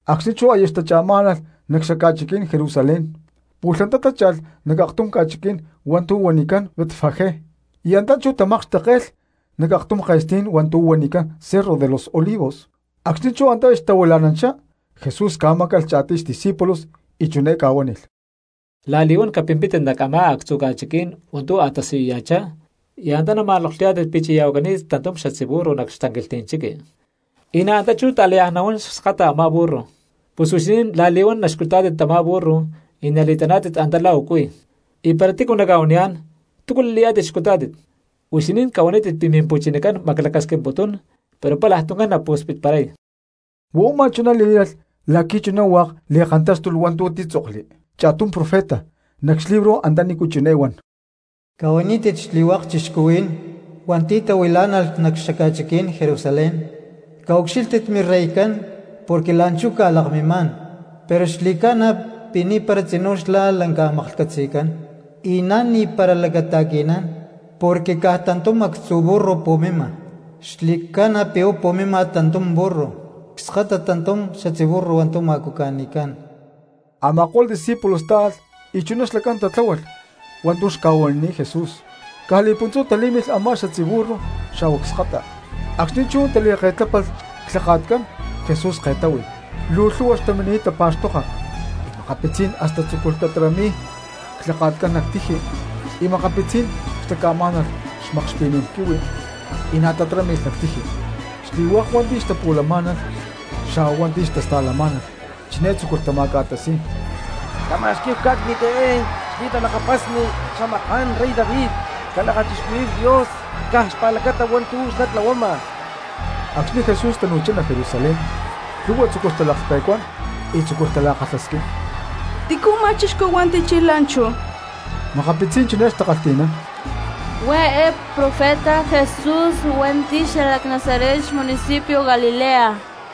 Acxni̠ chú aya xtacha̠má̠nalh nac xaca̠chiquí̠n Jerusalén, pu̠lh antá tácha̠lh nac aktum ca̠chiquí̠n hua̠ntu̠ huanicán Betfagé, y antá chú tamakxtekke̠lh nac aktum ke̠stí̠n hua̠ntu̠ huanicán Cerro de los Olivos. Acxni̠ chú antá xtahuila̠nanchá, Jesús ca̠máca̠lh cha̠tiy xdiscípulos y chiné ca̠huánilh: —La̠li̠huán capimpítit nac a̠má actzu ca̠chiquí̠n hua̠ntu̠ a̠tasiyuya̠chá y antá nama̠noklhuyá̠tit pi̠ chi̠ya̠huacani̠t tantum xatzí burro nac xtanquilhtí̠n chiqui, y na̠ antá chú ta̠láyaj nahuán cskata a̠má burro. Pus huixinín la̠li̠huán naxcutá̠tit tamá burro y nali̠taná̠tit antá la̠ u̠cuí. Y para tícu naca̠huaniyá̠n: “¿Túcu li̠layá̠tit xcutá̠tit?”, huixinín cahuanítit pi̠ Mimpu̠chinacán maclacasquimputún, pero palaj tuncán napu̠spitparay. Huá u̠má chuná lí̠lalh la̠qui̠ chuná hua̠k li̠kantáxtulh hua̠ntu̠ títzokli cha̠tum profeta nac xlibro antanícu chiné huán: Cahuanítit xli̠hua̠k cristianos hua̠nti̠ tahuilá̠nalh nac xaca̠chiquí̠n Jerusalén: “Caucxílhtit mireycán porque la̠nchú ca̠lakmimá̠n, pero xli̠ca̠na pi̠ ni̠para tzinú xlá lanca maklhcatzi̠cán, y na̠ ni̠para lacata̠qui̠nán, porque caj tantum actzu burro pu̠mima, xli̠ca̠na pi̠ huá pu̠mima tantum burro cskata tantum xatzí burro hua̠ntu̠ ma̠cuca̠ni̠cán.” Ama̠ko̠lh discípulos táalh y chuná xlacán tatláhualh hua̠ntu̠ xca̠huanini̠t Jesús. Caj li̠puntzú talí̠milh a̠má xatzí burro xa̠huá cskata; acxni̠ chú tali̠ke̠tlapánilh clhaka̠tcán Jesús ke̠táhui. Luu lhu̠hua cristianos xtamini̠t tapa̠xtoka y makapitzí̠n hasta tzúculh tatarami̠y clhaka̠tcán nac tiji, y makapitzí̠n xtaca̠má̠nalh xmakxpi̠ní̠n quihui y na̠ tatarámi̠lh nac tiji. Xli̠hua̠k cristianos hua̠nti̠ xtapu̠lamá̠nalh xa̠huá hua̠nti̠ xtasta̠lamá̠nalh chiné tzúculh tama̠ca̠tasi̠y: —¡Cama̠xquí̠hu cá̠cni̠t eé xli̠talakapasni xamaká̠n rey David! ¡Calakachixcuhuí̠hu Dios caj xpa̠lacata hua̠ntu̠ xlá tlahuama! Acxni̠ Jesús tanu̠chá nac Jerusalén lhu̠hua cristianos tzúculh talaklhpe̠cuán y tzúculh tala̠kalhasquín: —¿Tícu u̠má chixcú hua̠nti̠ chilh la̠nchú? Makapitzí̠n cristianos chiné xtakalhtí̠nán: —Huá eé profeta Jesús hua̠nti̠ xalac Nazaret cxmunicipio Galilea.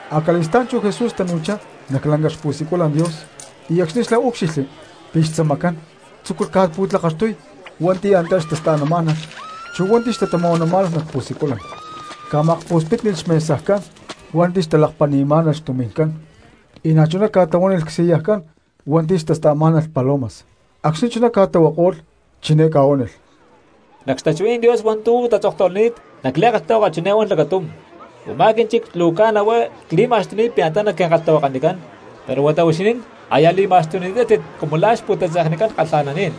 Acali̠stá̠n chú Jesús tanu̠chá nac lanca xpu̠siculan Dios y acxni̠ xlá úcxilhli pi̠ xtzamacán tzúculh ca̠pu̠tlakaxtuy hua̠nti̠ antá xtasta̠namá̠nalh chu hua̠nti̠ xtatama̠huanamá̠nalh nac pu̠siculan. Ca̠ma̠kpu̠spítnilh xmesajcán hua̠nti̠ xtalakpali̠má̠nalh xtumi̠ncán cristianos, y na̠chuná ca̠tlahuánilh csillajcán hua̠nti̠ xtasta̠má̠nalh palomas. Acxni̠ chuná ca̠tlahuako̠lh chiné ca̠huánilh: —Nac xtachuhuí̠n Dios hua̠ntu̠ tatzoktahuilani̠t nac li̠kalhtahuaka chiné huán lacatum: “Umá quínchic luu caj huá nali̠ma̠xtucán pi̠ antá naquinkalhtahuakanicán”; pero huata huixinín aya li̠ma̠xtuni̠tátit cumu la̠ xpu̠tatzeknicán kalha̠naní̠n.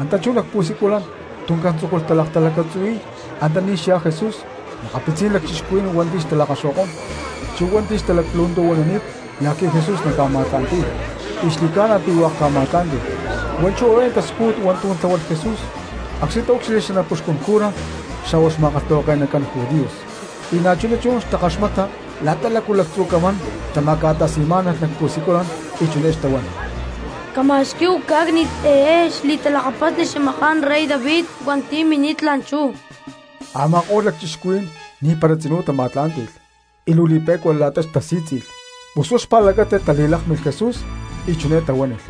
Antá chú nac pu̠siculan tuncán tzúculh talaktalacatzuhui̠y antaní xyá Jesús makapitzí̠n lacchixcuhuí̠n hua̠nti̠ xtalakaxo̠kó̠n, chu hua̠nti̠ xtalaclu̠ntu̠huanani̠t la̠qui̠ Jesús naca̠ma̠tla̠nti̠y, y xli̠ca̠na pi̠ hua̠k ca̠ma̠tlá̠nti̠lh. Huá chú eé xtascújut hua̠ntu̠ tláhualh Jesús acxni̠ taúcxilhli xanapuxcún cura xa̠huá xma̠kalhtahuake̠nacán judíos, y na̠chuná chú xtakaxmata la̠ta lácu lactzu camán xtama̠ca̠tasi̠má̠nalh nac pu̠siculan y chiné xtahuán: “¡Cama̠xquí̠hu cá̠cni̠t eé xli̠talakapasni xamaká̠n rey David hua̠nti̠ mini̠t la̠nchú!”, a̠ma̠ko̠lh lacchixcuhuí̠n ni̠para tzinú tama̠tlá̠nti̠lh y luu li̠pe̠cua la̠ta tasí̠tzi̠lh. Pus huá xpa̠lacata tali̠lákmilh Jesús y chiné tahuánilh: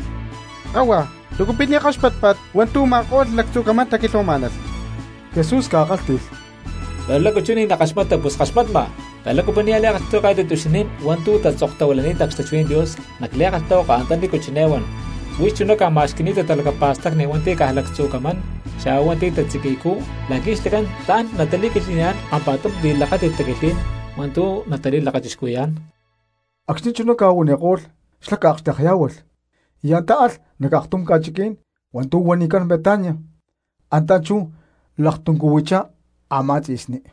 —¡Kahua! ¿Lácu pi̠ ni̠ kaxpátpa̠t hua̠ntu̠ u̠ma̠ko̠lh lactzu camán taquilhuamá̠nalh? Jesús ca̠kálhti̠lh: —¡Pero lácu chú ni̠ nackaxmata, pus ckaxmatma! Pero lácu pi̠ nia̠ li̠kalhtahuakayá̠tit huixinín hua̠ntu̠ tatzoktahuilani̠t xtachuhuí̠n Dios nac li̠kalhtahuaka antanícu chiné huán: Huix chuná ca̠ma̠xqui̠ni̠ta talacapa̠stacni hua̠nti̠ cajcu lactzu camán xa̠huá hua̠nti̠ tatziqui̠ycú, la̠qui̠ xlacán tla̠n natali̠quilhtli̠niyá̠n kampa̠tum li̠lakáti̠t taquilhtlí̠n hua̠ntu̠ natali̠lakachixcuhui̠yá̠n. Acxni̠ chuná ca̠huaniko̠lh xlá ca̠akxtekyá̠hualh y antá alh nac aktum ca̠chiquí̠n hua̠ntu̠ huanicán Betania, antá chú laktuncuhuichá a̠má tzi̠sní.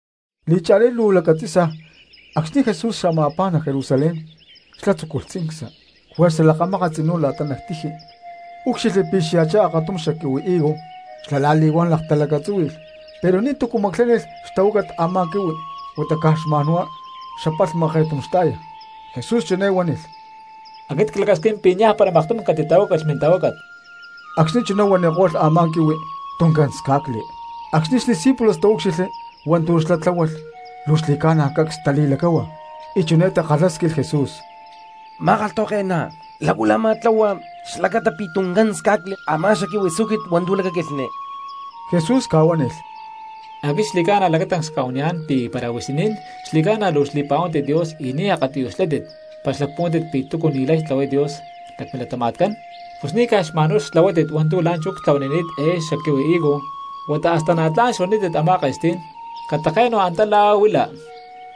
Li̠cha̠lí luu lacatzi̠sa acxni̠ Jesús xama̠pá nac Jerusalén xlá tzúculh tzincsa. Juerza lakamákat tzinú la̠ta nac tiji úcxilhli pi̠ xya̠chá akatum xaquihui higo xlá la̠li̠huán laktalacatzúhui̠lh pero ni̠tu̠cu maclánilh xtahuácat a̠má quihui huata caj xma̠nhuá xapalhma ke̠tum xta̠ya. Jesús chiné huánilh: —¡Aquit clacasquín pi̠ niajpara maktum catitahuácalh mintahuácat! Acxni̠ chuná huaniko̠lh a̠má quihui tuncán sca̠cli. Acxni̠ xdiscípulos taúcxilhli hua̠ntu̠ xlá tláhualh luu xli̠ca̠na cacs tali̠lacáhua y chiné takalhásquilh Jesús: —Ma̠kalhtahuake̠ná, ¿lácu la̠ a̠má tlahua xlacata pi̠ tuncán sca̠cli a̠má xaquihui higo hua̠ntu̠ lacaquilhni? Jesús ca̠huánilh: —Aquit xli̠ca̠na lacatancs cca̠huaniyá̠n pi̠ para huixinín xli̠ca̠na luu xli̠pa̠huántit Dios y ni̠ akatiyuj xlátit para xlacpuhuántit pi̠ túcu ni̠lay tlahuay Dios nac milatama̠tcán, pus ni̠ caj xma̠nhuá xtlahuátit hua̠ntu̠ la̠nchú ctlahuanini̠t eé xaquihui higo huata hasta na̠ tla̠n xuanítit a̠má ke̠stí̠n: “Catake̠nu antá la̠ huila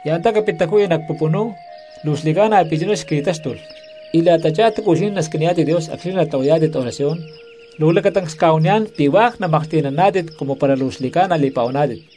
y antá capit taju̠ya nac pupunú”, luu xli̠ca̠na pi̠ chuná xqui̠táxtulh. Y la̠tachá túcu huixinín nasquiniyá̠tit Dios acxni̠ natlahuayá̠tit oración, luu lacatancs cca̠huaniyá̠n pi̠ hua̠k namaklhti̠naná̠tit cumu para luu xli̠ca̠na li̠pa̠huaná̠tit.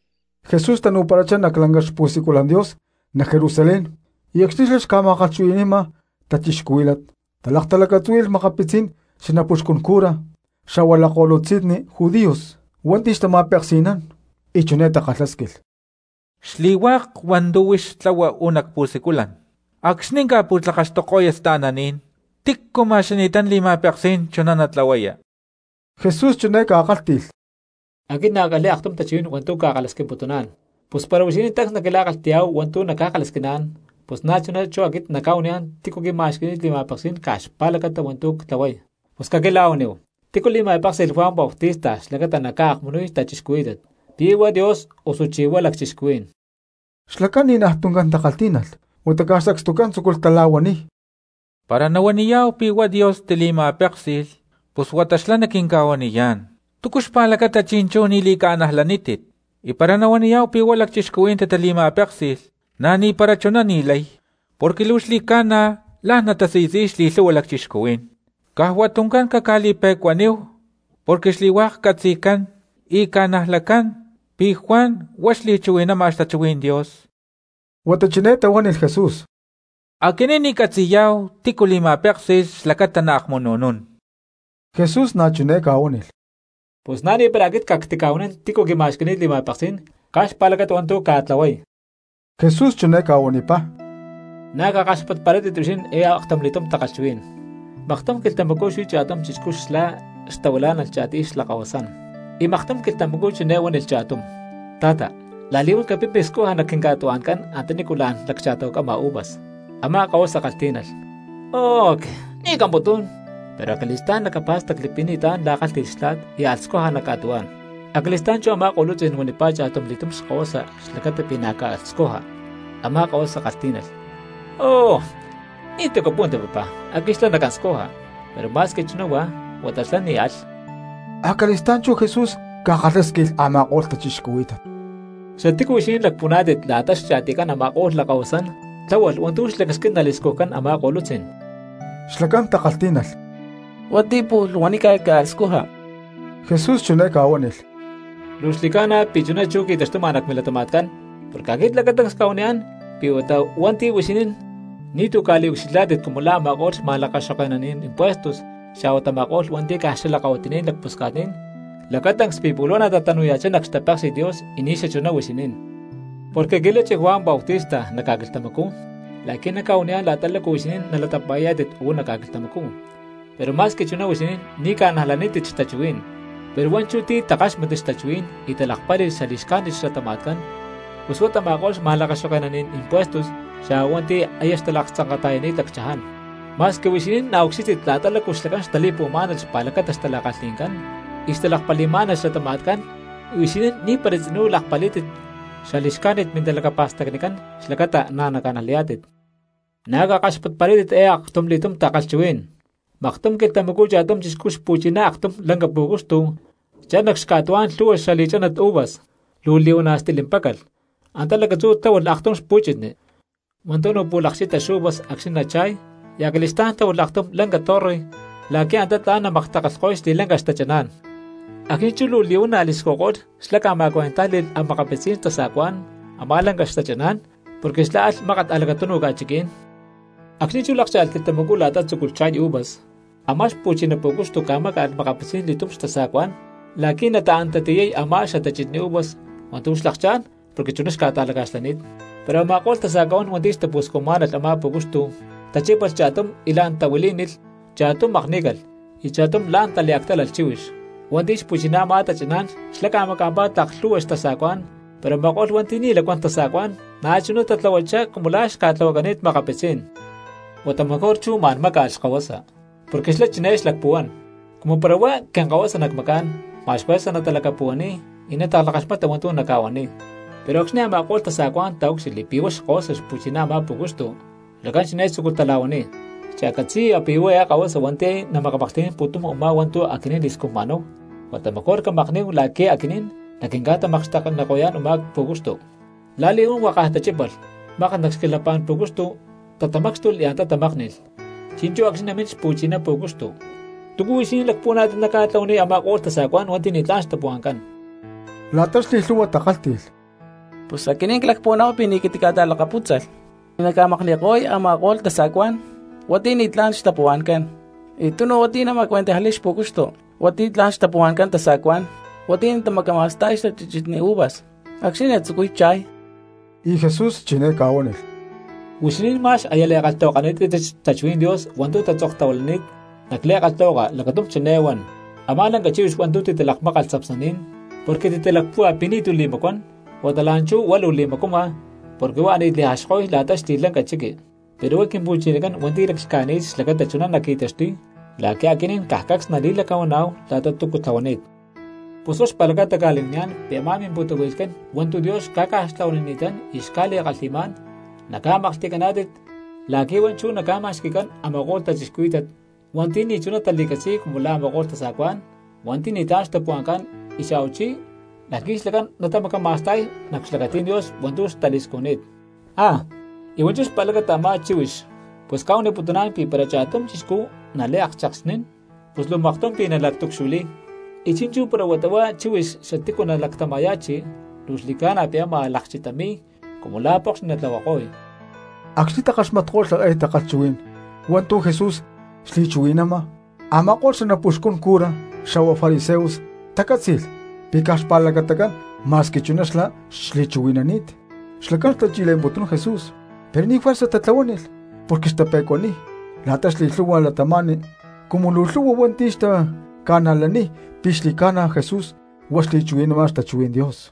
Jesús tanu̠parachá nac lanca xpu̠siculan Dios nac Jerusalén y acxni̠ xlá xca̠ma̠kalhchuhui̠ni̠ma cristianos talaktalacatzúhui̠lh makapitzí̠n xanapuxcún cura xa̠huá lakko̠lutzi̠nni judíos hua̠nti̠ xtama̠peksi̠nán; y chiné takalhásquilh: —Xli̠hua̠k hua̠ntu̠ huix tlahua uú nac pu̠siculan acxni̠ ca̠pu̠tlakaxtuko̠ya sta̠naní̠n, ¿tícu ma̠xqui̠ni̠tán li̠ma̠peksí̠n chuná natlahuaya? Jesús chiné ca̠kálhti̠lh: —Aquit na̠ ckalhi̠y aktum tachuhuí̠n hua̠ntu̠ cca̠kalhasquimputuná̠n, pus para huixinín tancs naquila̠kalhti̠yá̠hu hua̠ntu̠ nacca̠kalhasquiná̠n pus na̠chuná chú aquit nacca̠huaniyá̠n tícu quima̠xqui̠ni̠t li̠ma̠peksí̠n caj xpa̠lacata hua̠ntu̠ ctlahuay. Pus caquila̠huaníhu, ¿tícu li̠ma̠péksi̠lh Juan Bautista xlacata naca̠akmunuy cristianos? ¿Pi̠ huá Dios, osuchí huá lacchixcuhuí̠n? Xlacán ni̠naj tuncán takalhtí̠nalh, huata caj sacstucán tzúculh tala̠huaniy: —Para nahuaniyá̠hu pi̠ huá Dios tili̠ma̠péksi̠lh, pus huata xlá naquinca̠huaniyá̠n: “¿Túcu xpa̠lacata chi̠nchú ni̠ li̠ca̠najlanítit?” Y para nahuaniyá̠hu pi̠ huá lacchixcuhuí̠n titali̠ma̠péksi̠lh, na̠ni̠para chuná ni̠lay, porque luu xli̠ca̠na la̠n natasi̠tzi̠y xli̠lhu̠hua cristianos caj huá tuncán caca̠li̠pe̠cuaníhu, porque xli̠hua̠k catzi̠cán y ca̠najlacán pi̠ Juan huá xli̠chuhui̠nama xtachuhuí̠n Dios. Huata chiné tahuánilh Jesús: —Aquinín ni̠ ccatzi̠yá̠hu tícu li̠ma̠péksi̠lh xlacata naakmunu̠nún. Jesús na̠ chiné ca̠huánilh: —Pus na̠nipara aquit cactica̠huanín tícu quima̠xqui̠ni̠t li̠ma̠peksí̠n caj xpa̠lacata hua̠ntu̠ cca̠tlahuay. Jesús chiné ca̠huanipá: —Na̠ cakaxpatparátit huixinín eé aktumli̠túm takalhchuhuí̠n: Maktum quilhtamacú xuí cha̠tum chixcú xlá xtahuilá̠nalh cha̠tiy xlakahuasán. Y maktum quilhtamacú chiné huánilh cha̠tum: “Ta̠ta, la̠li̠huán capimpi scuja nac quinca̠tuhua̠ncán antanícu la̠n laccha̠tahuacama uvas.” Amá kahuasa kalhtí̠nalh: “¡Oh que, ni̠ camputún!” Pero acali̠stá̠n lacapá̠stacli pi̠ ni̠tlá̠n la̠ kálhti̠lh xtla̠t y alh scuja nac ca̠tuhuá̠n. Acali̠stá̠n chú a̠má ko̠lutzí̠n huanipá cha̠tumli̠túm xkahuasa xlacata pi̠ na̠ caalh scuja. Amá kahuasa kalhtí̠nalh: “¡Oh, ni̠tu̠ capúhuanti papá, aquit xlá nacán scuja!” Pero ma̠squi chuná huá, huata xlá ni̠ alh. Acali̠stá̠n chú Jesús ca̠kalhásquilh a̠ma̠ko̠lh cristianos: —¿Xatícu huixinín lacpuhuaná̠tit la̠ta xli̠cha̠tiycán a̠ma̠ko̠lh lakahuasán tláhualh hua̠ntu̠ xlacasquín nali̠scujcán a̠má ko̠lutzí̠n? Cristianos takalhtí̠nalh: —Hua̠nti̠ pu̠lh huanícalh caalh scuja. Jesús chiné ca̠huánilh: —Luu xli̠ca̠na pi̠ chuná chú qui̠taxtuma nac milatama̠tcán, porque aquit lacatancs cca̠huaniyá̠n pi̠ huata huá hua̠nti̠ huixinín ni̠tu̠ ca̠liucxilhá̠tit cumu la̠ a̠ma̠ko̠lh xma̠lakaxoke̠naní̠n impuestos xa̠huá tama̠ko̠lh hua̠nti̠ caj xalakahuitiní̠n lacpusca̠tní̠n, lacatancs pi̠ pu̠lh huá natatanuya̠chá nac xtapéksi̠t Dios y ni̠xachuná huixinín. Porque qui̠lachi Juan Bautista nac ca̠quilhtamacú la̠qui̠ naca̠huaniyá̠n la̠ta lácu huixinín nalatapa̠yá̠tit uú nac ca̠quilhtamacú, pero ma̠squi chuná huixinín ni̠ ca̠najlanítit xtachuhuí̠n. Pero hua̠nchú ti̠ takáxmatli xtachuhuí̠n y talakpáli̠lh xali̠xcájnit xlatama̠tcán pus huá tama̠ko̠lh xma̠lakaxoke̠naní̠n impuestos xa̠huá hua̠nti̠ aya xtalaktzanka̠ta̠yani̠t lacchaján. Ma̠squi huixinín na̠ ucxílhtit la̠ta lácu xlacán xtali̠puhuamá̠nalh xpa̠lacata xtala̠kalhi̠ncán y xtalakpali̠má̠nalh xlatama̠tcán huixinín ni̠para tzinú lakpalí̠tit xali̠xcájnit mintalacapa̠stacnicán xlacata na̠ naca̠najlaniyá̠tit. ’Na̠ cakaxpatparátit eé aktumli̠túm takalhchuhuí̠n: Maktum quilhtamacú cha̠tum chixcú xpu̠chiná aktum lanca pú̠cuxtu chalh nac xca̠tuhuá̠n lhu̠hua xali̠chánat uvas. Luu li̠huana̠ stilimpácalh, antá lacatzú tláhualh aktum xpu̠chitni hua̠ntu̠ napu̠lakchita xuvas acxni̠ nacha̠y, y acali̠stá̠n tláhualh aktum lanca torre la̠qui̠ antá tla̠n namaktakalhko̠y xli̠lanca xtachaná̠n. Acxni̠ chú luu li̠huana̠ li̠scujko̠lh xlá ca̠ma̠cuentájli̠lh makapitzí̠n tasa̠cuá̠n a̠má lanca xtachaná̠n, porque xlá alh mákat nac a̠lacatunu ca̠chiquí̠n. Acxni̠ chú lákcha̠lh quilhtamacú la̠ta tzúculh cha̠y xuvas, a̠má xpu̠chiná pú̠cuxtu ca̠máca̠lh makapitzí̠n li̠tum xtasa̠cuá̠n la̠qui̠ nataán tatiyay a̠má xatachitni uvas hua̠ntu̠ xlakchá̠n porque chuná xca̠ta̠laca̠xlani̠t. Pero a̠ma̠ko̠lh tasa̠cuá̠n hua̠nti̠ xtapu̠scujmá̠nalh a̠má pú̠cuxtu tachípalh cha̠tum y la̠n tahuilí̠nilh, cha̠tum makní̠calh y cha̠tum la̠n taliactálalh chíhuix. Hua̠nti̠ xpu̠chiná a̠má tachaná̠n xlá ca̠maca̠mpá tlak lhu̠hua xtasa̠cuá̠n pero a̠ma̠ko̠lh hua̠nti̠ ni̠ lacuán tasa̠cuá̠n na̠chuná tatlahuachá cumu la̠ xca̠tlahuacani̠t makapitzí̠n. ’Huata mejor chú ma̠n máca̠lh xkahuasa, porque xlá chiné xlacpuhuán: “Cumu para huá quinkahuasa nacmacá̠n ma̠x juerza natalacapuhuaniy y natakalhakaxmata hua̠ntu̠ naca̠huaniy.” Pero acxni̠ a̠ma̠ko̠lh tasa̠cuá̠n taúcxilhli pi̠ huá xkahuasa xpu̠chiná a̠má pú̠cuxtu, xlacán chiné tzúculh tala̠huaniy: “Cha̠catzi̠ya pi̠ huá eé kahuasa hua̠nti̠ namakamaklhti̠nán pu̠tum u̠má hua̠ntu̠ aquinín li̠scujma̠náhu, huata mejor camakní̠hu la̠qui̠ aquinín naquinca̠tamakxtekniko̠yá̠n u̠má pú̠cuxtu.” La̠li̠huán huakaj tachípalh, mákat nac xquilhapá̠n pú̠cuxtu tatamácxtulh y antá tamákni̠lh. ’Chi̠nchú acxni̠ namín xpu̠chiná pú̠cuxtu, ¿túcu huixinín lacpuhuaná̠tit naca̠tlahuaniy a̠ma̠ko̠lh tasa̠cuá̠n hua̠nti̠ ni̠tlá̠n xtapuhua̠ncán? La̠ta xli̠lhu̠hua cristianos takálhti̠lh: —Pus aquinín clacpuhuaná̠hu pi̠ ni̠ catica̠ta̠lakapútzalh y naca̠makni̠ko̠y a̠ma̠ko̠lh tasa̠cuá̠n hua̠nti̠ ni̠tlá̠n xtapuhua̠ncán, y tunu hua̠nti̠ naca̠ma̠cuentajli̠y xpu̠cuxtu hua̠nti̠ tla̠n xtapuhua̠ncán tasa̠cuá̠n hua̠nti̠ natamacama̠sta̠y xatachitni uvas acxni̠ natzucuy cha̠y. Y Jesús chiné ca̠huánilh: —Huixinín ma̠x aya li̠kalhtahuakani̠tátit xtachuhuí̠n Dios hua̠ntu̠ tatzoktahuilani̠t nac li̠kalhtahuaka lacatum chiné huán: Amá lanca chíhuix hua̠ntu̠ titalakmákalh tzapsnaní̠n porque titalacpúhua pi̠ ni̠tu̠ li̠macuán, huata la̠nchú huá luu li̠macuama porque huá ani̠t li̠jaxko̠y la̠ta xli̠lanca chiqui. Pero huá Quimpu̠chinacán hua̠nti̠ laclhca̠ni̠t xlacata chuná naqui̠taxtuy, la̠qui̠ aquinín caj cacs nali̠lacahuaná̠hu la̠ta túcu tlahuani̠t. Pus huá xpa̠lacata cca̠li̠huaniyá̠n pi̠ a̠má mimpu̠tahui̠lhcán hua̠ntu̠ Dios xca̠ca̠xtlahuanini̠tán y xca̠li̠kalhi̠má̠n, naca̠maklhti̠caná̠tit la̠qui̠ huá chú naca̠ma̠xqui̠cán a̠ma̠ko̠lh cristianos hua̠nti̠ ni̠chuná tali̠catzi̠y cumu la̠ a̠ma̠ko̠lh tasa̠cuá̠n hua̠nti̠ ni̠tlá̠n xtapuhua̠ncán y xa̠huachí la̠qui̠ xlacán natamacama̠sta̠y nac xlacatí̠n Dios hua̠ntu̠ tali̠scujni̠t. ¡Ah! Y hua̠nchú xpa̠lacata a̠má chíhuix, pus cca̠huaniputuná̠n pi̠ para cha̠tum chixcú naliakchekxnín, pus luu maktum pi̠ nalactucxtahuilay, y chi̠nchú para huata huá chíhuix xatícu naactama̠ya̠chi luu xli̠ca̠na pi̠ ámaj lakchitami̠y y cumu la̠ pokxni natlahuako̠y. Acxni̠ takaxmatko̠lh eé takalhchuhuí̠n hua̠ntu̠ Jesús xli̠chuhui̠nama, a̠ma̠ko̠lh xanapuxcun cura xa̠huá fariseos tacátzi̠lh pi̠ caj xpa̠lacatacán ma̠squi chuná xlá xli̠chuhui̠nani̠t. Xlacán xtachi̠le̠mputún Jesús pero ni̠ juerza tatlahuánilh porque xtape̠cuaniy la̠ta xli̠lhu̠hua cristianos cumu luu lhu̠hua hua̠nti̠ xtaca̠najlay pi̠ xli̠ca̠na Jesús huá xli̠chuhui̠nama xtachuhuí̠n Dios.